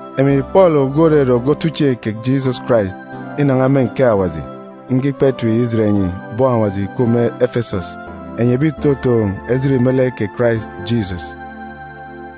Emi Pọọlu, ogwu òrere ogwu otuchieen̄ kè Jisọs Karais inan̄a me nkeek Awaji, nge ikpa etip yi ijet enyi bọn Awaji ìkup me Efesọs, enyi ebi ìtotoon̄ ejit me lek kè Karais Jisọs.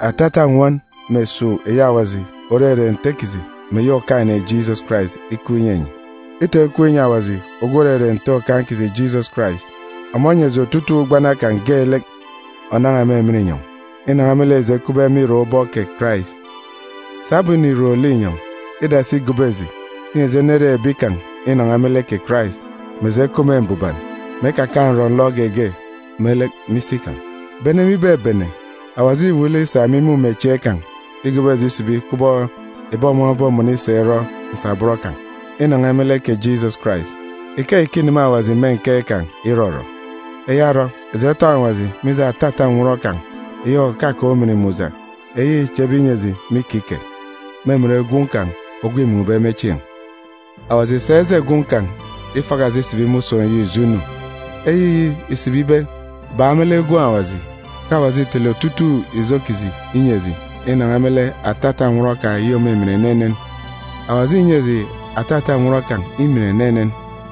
Atata nnwọn mè esuuk eyi Awaji òrere Nte kiji mè eyi Okaan̄-ene Jisọs Karais ikup inyi enyi. Itọn̄ ikup inyi Awaji ogwu òrere Nte Okaan̄ kiji Jisọs Karais. Ọmọ onyi eji otutuuk ugbana kan̄ geelek ònan̄a me emen inyọn̄, inan̄a me lek eji ekupbe me irak ubọk kè Karais. Sabum înirom linyọn̄, îdasi igobo eji, inyi eji enere ebi kan̄ inan̄a me lek kè Karais, mè eji ekup me mbuban, mè ekakaan̄ nrọ-nlọ geege me lek me isi kan̄. Bene me ibebene, Awaji îwuuk lek isa me imumechieen̄ kan̄ igobo eji isibi kubọk ebi ọmọ obomọnọ isa irọ nsabọn kan̄, inan̄a me lek kè Jisọs Karais. Ikeyi ke îneme Awaji me nkeek kan̄ irọrọ. Eya orọ, eji etọn̄ Awaji mije atata nnwọn kan̄, òkakaan̄ ujamgbugbo, eyi îchebe inyi eji me ikike, me emen Gwun̄ kan̄ ogwu îmun̄be me chieen̄. Awaji ìsa eje Gwun̄ kan̄ ifaka eji isibi me usun̄ eyi ijo inu. Eyiyi ìsibi ibe, bak me lek Gwun̄ Awaji, ke Awaji îtele otutuuk ijo kiji inyi eji inan̄a me lek atata nnwọn kan̄ eyi òmimin enenen. Awaji înyi eji atata nnwọn kan̄ imin enenen.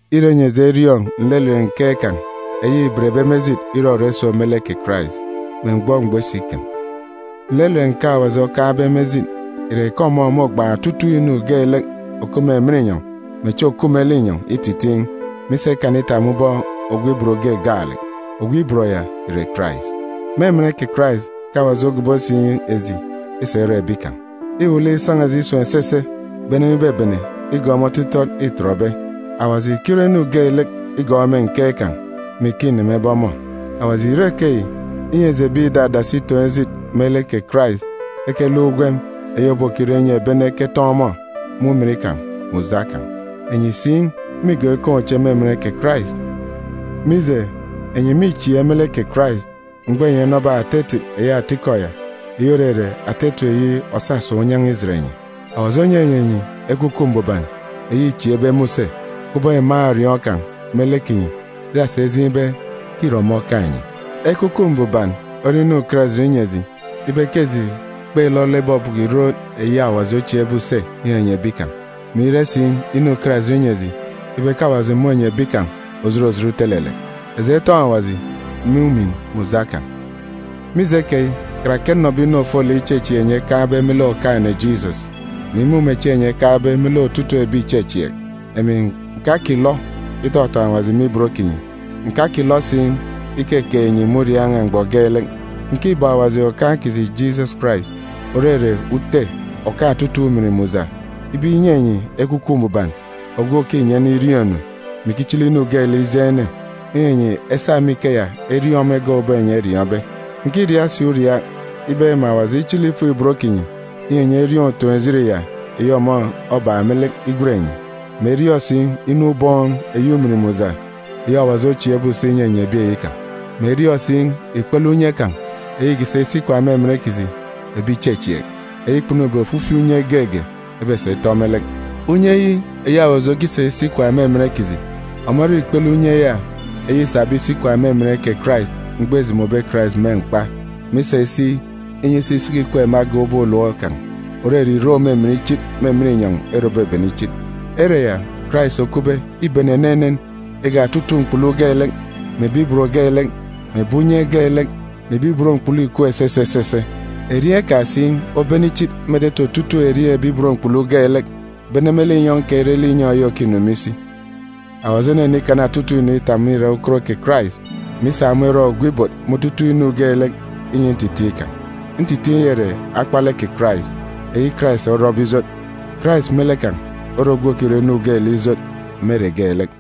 irọ inyi eji eriọọn̄ nlelet nkeek kan̄ eyi îbenbe me ejit irọrọ iso me lek kè Karais, me mgbọ mgbọ isikem. Nlelet nkeek Awaji okaan̄be me ejit ìre ke ọmọ môgbaan̄ otutuuk inu geelek òkup me emen inyọn̄ mè echi òkup me linyọn̄ ititiin̄, mè isa ikana itap me ubọk ogwu ibot ge gaalek. Ogwu ibot ya ìre Karais. Me emen kè Karais ke Awaji ogobo si eji isa irọ ebi kan̄. Îwuuk lek isan̄a eji isun̄ esese bene me ibebene igọọk me otitọt îtọtbe. Awaji ìkirọ inu geelek igọọk me nkeek kan̄, mè ike înemebe ọmọ. Awaji ìrọ ikeyi, inyi eji ebi ìdadasi itoon̄ ejit me lek kè Karais ekeluk ugwem eyi òbokirọ inyi ebi ene eketọn̄ ọmọ me ujamgbugbo kan̄. Enyi si mîgọọk ikaan̄ uche me emen kè Karais. Mije, enyi mîchieek me lek kè Karais, mgbọ enyi enọbe ata etip eyi atikọ ya, eyi òrere ata etip eyi òsasa unyan̄a ijet enyi. Awaji onyinyi enyi Ekwukwu Mbuban, eyi îchieekbe me use, kubọk iman̄ òriọọn̄ kan̄ me lek kinyi, isasa ijeen̄ ibe ke îre ọmọ okaan̄ enyi. Ekwukwu Mbuban ore inu ukarajit inyi eji ibe ke eji kpêlọlọ ibọbọkọ ìrot eyi Awaji ochieekbe use inyinyi ebi kan̄, mè ire si inu ukarajit inyi eji ibe ke Awaji mônyi ebi kan̄ òjot òjot utelelek. Eji etọn̄ Awaji me ujamgbugbo kan̄! Mije keyi, karake nnọbe inu ofolek ichechieek enyi ekaan̄be me lek Okaan̄-ene Jisọs, mè imumechieen̄ enyi ekaan̄be me lek otutuuk ebi ìchechieek, emi ǹkakilọ itọtọn̄ Awaji me ibot kinyi, ǹkakilọ si ikekeek enyi me uriaak n̄a mgbọ geelek. Ǹkibeek Awaji Okaan̄ kiji Jisọs Karais, òrere Ute òkaan̄ otutuuk ujamgbugbo, ibe inyi enyi Ekwukwu Mbuban ogwu òkinyi ene iriọọn̄-inu, mè ikichili inu geelek ijeen̄ ene, inyi enyi esa me ikeya eriọọn̄ ọmọ egak ubọk enyi eriọọn̄be. Ǹkiriaak si uriaak ibe mè Awaji ichili ifuk-ibot kinyi, inyi enyi eriọọn̄ utoon̄-ejit ya eyi ọmọ obak me lek igwen enyi, mè eriọọn̄ si inu ubọọn̄ eyi ujamgbugbo, eyi Awaji ochieekbe use inyinyi ebi kan̄, mè eriọọn̄ si ikpele unye kan̄, eyi îkisa isi ikwaan̄ me emen kiji ebi ìchechieek, eyi kpunube ofifi unye geege ebesa itọ me lek. Unye yi, eyi Awaji okisa isi ikwaan̄ me emen kiji, ọmọ ore ikpele unye ya eyi îsabe isi ikwaan̄ me emen kè Karais mgbọ îjomobe Karais me mkpa, mè isa isi, inyi isi isiki ikweek me agan̄ ubọk ulom kan̄, òrere irek òmimin ichit, me emen inyọn̄, ere òbebene ichit. Ere ya Karais okupbe îbene enenen igak otutuuk mkpulu geelek, mè ebi ibot geelek, mè ebi unye geelek, mè ebi ibot mkpulu ìkup esese esese. Erieen̄ kan̄ si obene ichit me etete otutuuk erieen̄ ebi ibot mkpulu geelek, bene me linyọn̄ keyi re linyọn̄ eyi òkinu me isi. Awaji onenikana otutuuk inu itap me irak ukot kè Karais, mè isa ọmọ irọ ogwu ibot me otutuuk inu geelek inyi ntitiin̄ kan̄. Ntitiin̄ ya ìre akpalek kè Karais eyi Karais orọbe ijot. Karais me lek kan̄ ore ogwu òkirọ inu geelek ijot me ere geelek.